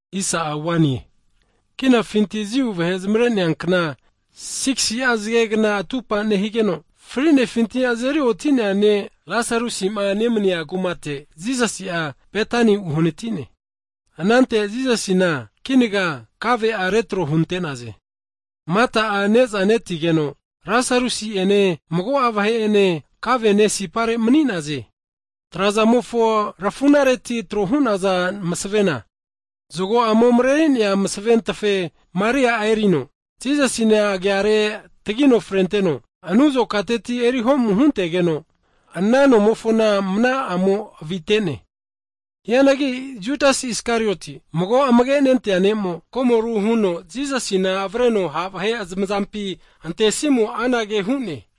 Hagi kinafinti Jiu vahe zamare'nea kna (Pasova) 6si'a zagegna atupa nehigeno, fri'nefinti azeri oti'nea ne' Lasarusi'ma nemania kumate Jisasi'a Betani uhanati'ne. Anante Jisasi'ma hu'nea ne'zana retro hunte'naze. Mata'a ne'za netigeno Lasarusi'ene, mago'a vahe'ene kave'ne sipare mani'naze. Trazamofo rafu'nareti tro hu'naza msavena, zago'amo mareri'nea masaventafe Maria'a erino, Jisasina agiare tagino frenteteno, anu azokateti eri ho'mu huntegeno, ana nomofona mana'amo avite'ne. Hianagi Judas Iskarioti'a, mago amagenentea disaipol ne'mo, komoru huno Jisasina avreno ha' vahe zamazampi antesimo'a anage hu'ne,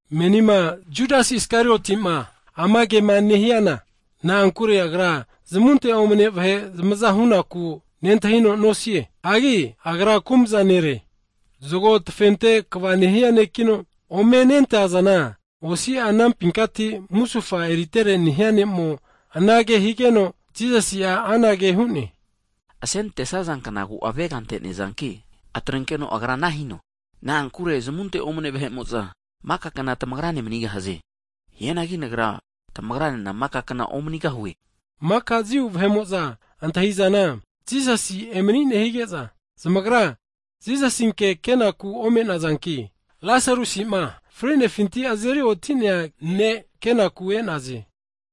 Menima Judas Iskariotima ama kema nehiana, na'ankure agra zamunte omne vahe zamaza hunaku nentahino nosie, hagi agra kumza nere. Zago tafente kva nehia nekino, mago'a zagoma ome nentazana anampinkati musufa eritere nehia ne'mo anage higeno, Jisasi'a anage hu'ne, Asenante'saza knagu avega ante'nea zanki, atrenkeno agra ana hino. Na'ankure zamunte omne vahe'mo'za maka kna tamagra ne manigahaze, hianagi Nagra, tamagra nena maka kna omanigahue. Hagi maka Jiu vahe'mo'za antahi'zana Jisasi emani'ne hige'za, zamagra Jisasinke kenaku ome'nazanki, Lasarusima, fri'nefinti azeri oti'nea ne' kenaku e'naze.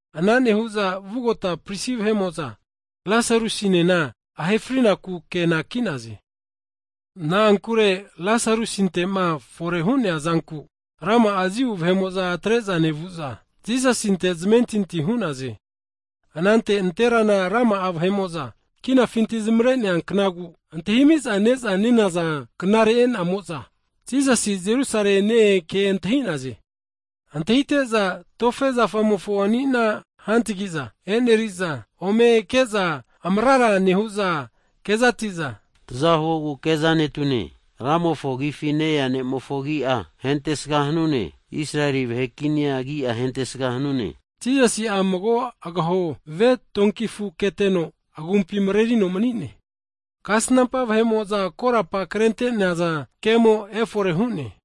Hianagi vugota pristi vahe'mo'za Lasarusi'nena ahe frinaku ke anaki'naze. Na'ankure Lasarusinte'ma fore hu'nea'zanku, rama'a Jiu vahe'mo'za atre'za nevu'za Jisasinte zamentinti hu'naze. Anante nanterana rama'a vahe'mo'za, kinafinti zamare'nea knagu antahimiza ne'za (Pasova) nenaza knare e'namo'za, Jisasi'a Jerusalemi ne-ea ke antahi'naze. Antahite'za tofe zafamofo ani'na (Palm tree) hantagi'za e'neri'za, ome ke'za amrara nehu'za kezati'za, Taza huogu ke'za netune! (Hosana!) Ramofo Agifi ne-ea nera agi'a hentesga hanune! Israeli vahe'mofo kinia agi'a hentesga hanune! Hagi Jisasi'a mago agaho ve tonki afu keteno, agumpi mrerino mani'ne, kasnampa vahe'mo'za korapa krente'naza kemo efore hu'ne.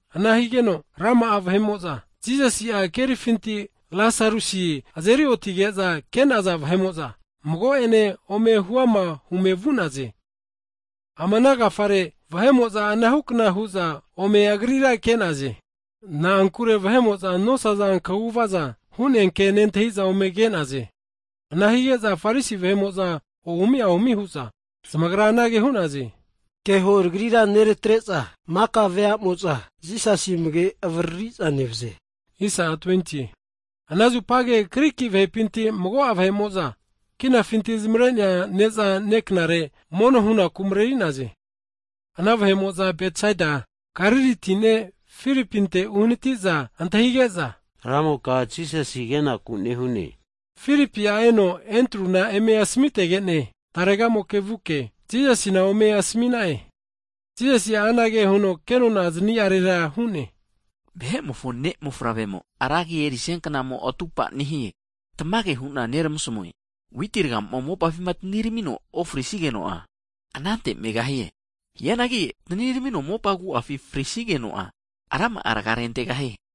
Ana higeno, rama'a vahe'mo'za, Jisasi'a kerifinti Lasarusi azeri otige'za ke'naza vahe'mo'za, mago'ene ome huama hume vu'naze. Ama'na agafare, vahe'mo'za anahu kna hu'za ome Agrira ke'naze. Na'ankure vahe'mo'za nosaza kaguvaza (mirakol) hu'nea ke nentahi'za ome ke'naze. Ana hige'za Farisi vahe'mo'za ohumi ahumi hu'za zamagra anage hu'naze, keho tagrira neratre'za maka vea'mo'za Jisasi amage avriri'za nevze. Hagi ana zupage Griki vahepinti mago'a vahe'mo'za, kinafinti zamare'nea ne'za ne'knare mono hunaku mareri'naze. Ana vahe'mo'za Galili kazigati Betsaida kumateti ne' Filipinte uhaniti'za antahige'za, ramoka Jisasi kenaku nehune. Filipi'a eno Andruna eme asmitege'ne, tarega'moke vu'ke, Jisasina ome asmi'na'e. Jisasi'a anage huno kenona zani'arera hu'ne, Vahe'mofo Mofavremo ra agi erisia kna atupa nehie. Tamage hu'na neramasmue, witi ragamo'ma mopafi taniramino ofrisigeno'a anante megahie. Hianagi taniramino mopa agu'afi frisigeno'a rama'a raga'a rentegahie.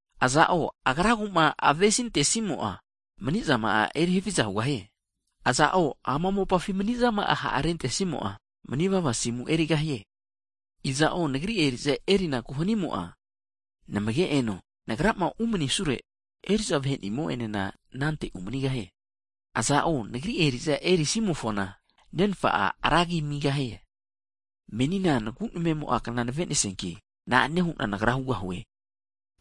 Aza'o agragu'ma avesi antesimo'a, asimu'a atregahie. Iza'o ama mopafi mani'zama'a ha'rentesimo'a, manivava asimu erigahie. Iza'o, Nagri eri'za erinaku hanimo'a, namage eno. Nagrama umanisure, eri'za vahe nimo'enena anante umanigahie, iza'o, Nagri eri'za erisimofona, Nenfa'a ra agi amigahie. Menina Nagu namemo kna navenesianki, na'ane hu'na Nagra hugahue,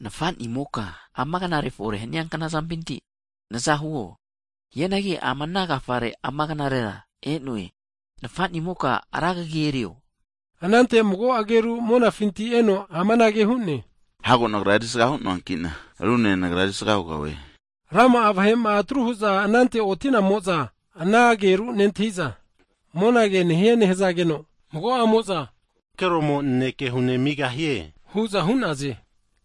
Nafa'nimoka, ama knare (aua) fore hania knazampinti naza huo, hianagi ama'na agafare ama knarera (aua) e'noe. Nafa'nimoka, ra kagi erio. Anante mago ageru monafinti eno amanage hu'ne, Hago Nagra erisaga hu'noanki'na, rune Nagra erisaga hugahue hu'ne. Rama'a vahe'ma atru hu'za anante oti'namo'za, ana ageru nentahi'za, monage nehie nehazageno, mago'amo'za ankeromo naneke hu nemigahie hu'za hu'naze.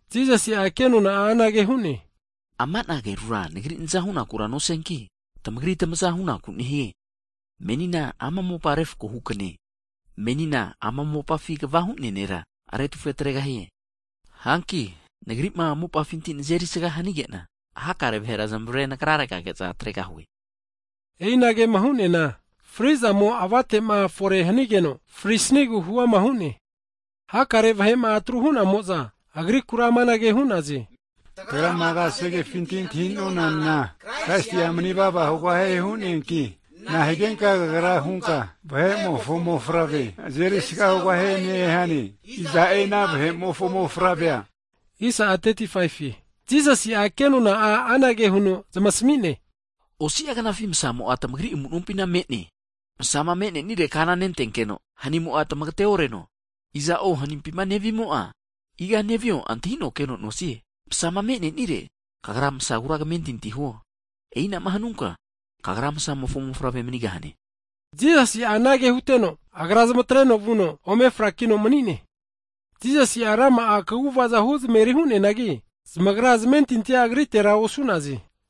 Jisasi'a kenona'a anage hu'ne, Ama'na agerura Nagri naza hunakura nosianki, tamagri tamaza hunaku nehie. Menina ama mopa refkohu knae, menina ama mopafi kva hu'nea nera retufe atregahie. Hanki, Nagri'ma mopafinti nazeri'sga hanige'na, hakare vahera zamare Nagrarega atregahue, E'inagema hu'neana, fri'zamo avate'ma fore hanigeno frisnigu huama hu'ne. Hakare vahe'ma atru hu'namo'za, Agrikura amanage hu'naze, tagrama kasegefinti'ma antahi'nonana, Kraisi'a manivava hugahie hu'neanki, nahigenka Kagra hunka, Vahe'mofo Mofavrea azerisga hugahie nehane? Iza'e ana Vahe'mofo Mofavre'a? Hazageno Jisasi'a kenona anage huno zamasmi'ne, Osi'a knafi Msamo'a tamagri amu nompina me'ne. Msama me'nenire kana nentenkeno hanimo'a tmagate oreno, iza'o hanimpima nevimo'a, iga nevio antahino keno nosie. Masama me'nenire, kagra Masagura kamentinti'a huo, e'inama hanunka kagra Masamofo mofavre manigahane. Jisasi'a anage huteno, Agra zamatreno vuno ome frakino mani'ne. Jisasi'a rama'a kaguvaza (mirakol) huzmeri hu'neanagi, zamagra zamentintia Agritera osu'naze.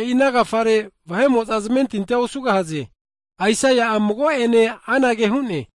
E'i ana agafare vahe'mo'za zamentinti nosaze. Aisaia'a mago'ene anage hu'ne,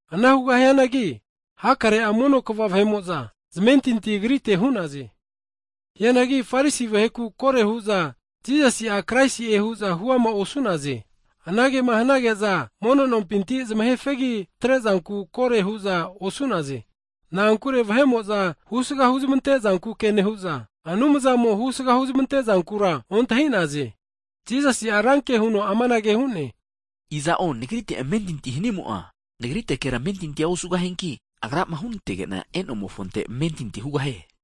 Ana hianagi hakare'a mono kva vahe'mo'za zamentinti Agrite hu'naze. Hianagi Farisi vaheku kore hu'za Jisasi'a, Kraisi'e hu'za huama osu'naze, anagema hanage'za mono nompinti (Sinagog) zamahe fegi atre'zanku kore hu'za osu'naze, Na'ankure vahe'mo'za husga huzmante zanku nehu'za, Anumzamo husga huzmante zankura ontahi'naze. Jisasi'a ranke huno amanage hu'ne, Iza'o Nagrite amentinti nehimo'a hanimo'a, Nagritekera amentinti nosianki, Agrama hunantege'na e'nomofonte amentinti hugahie.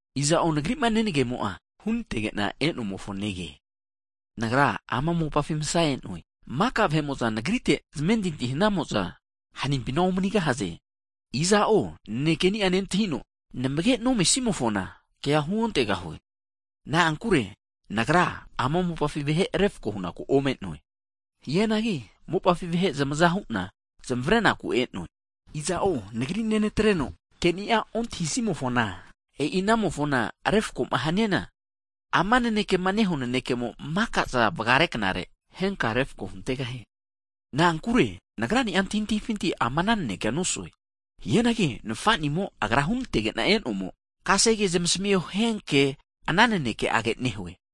Iza'o Nagri'ma nenagemo'a, hunantege'na e'nomofo nege. Nagra ama mopafi Masa e'noe, maka vahe'mo'za Nagrite zamentinti hanamo'za hanimpina omanigahaze. Iza'o nanekeni'a nentahino, amage nontemofona nanekea huontegahue. Na'ankure Nagra ama mopafi vahe refko hunaku ome'noe. Hianagi mopafi vahe zamaza hu'na zamavarenaku e'noe. Iza'o Nagri nenatreno, ke'ni'a ontahisimofona, e'i anamofona refko'ma haniana, ama nanekema nehua nanekemo maka'za vagare knare, henka'a refko huntegahie. Na'ankure Nagrani'a antahintahifinti ama nanekea nosue, hianagi Nfanimo Agra hunantege'na e'nomo, zamasmio hianke ana naneke'age nehue.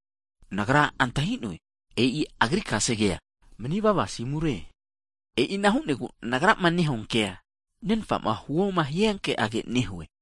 Nagra antahi'noe, Agrama hiho hia kefi mani vava asimura me'ne. E'ina hu'negu Nagrama nehua kea Nenfa'ma huoma hia ke'age nehue.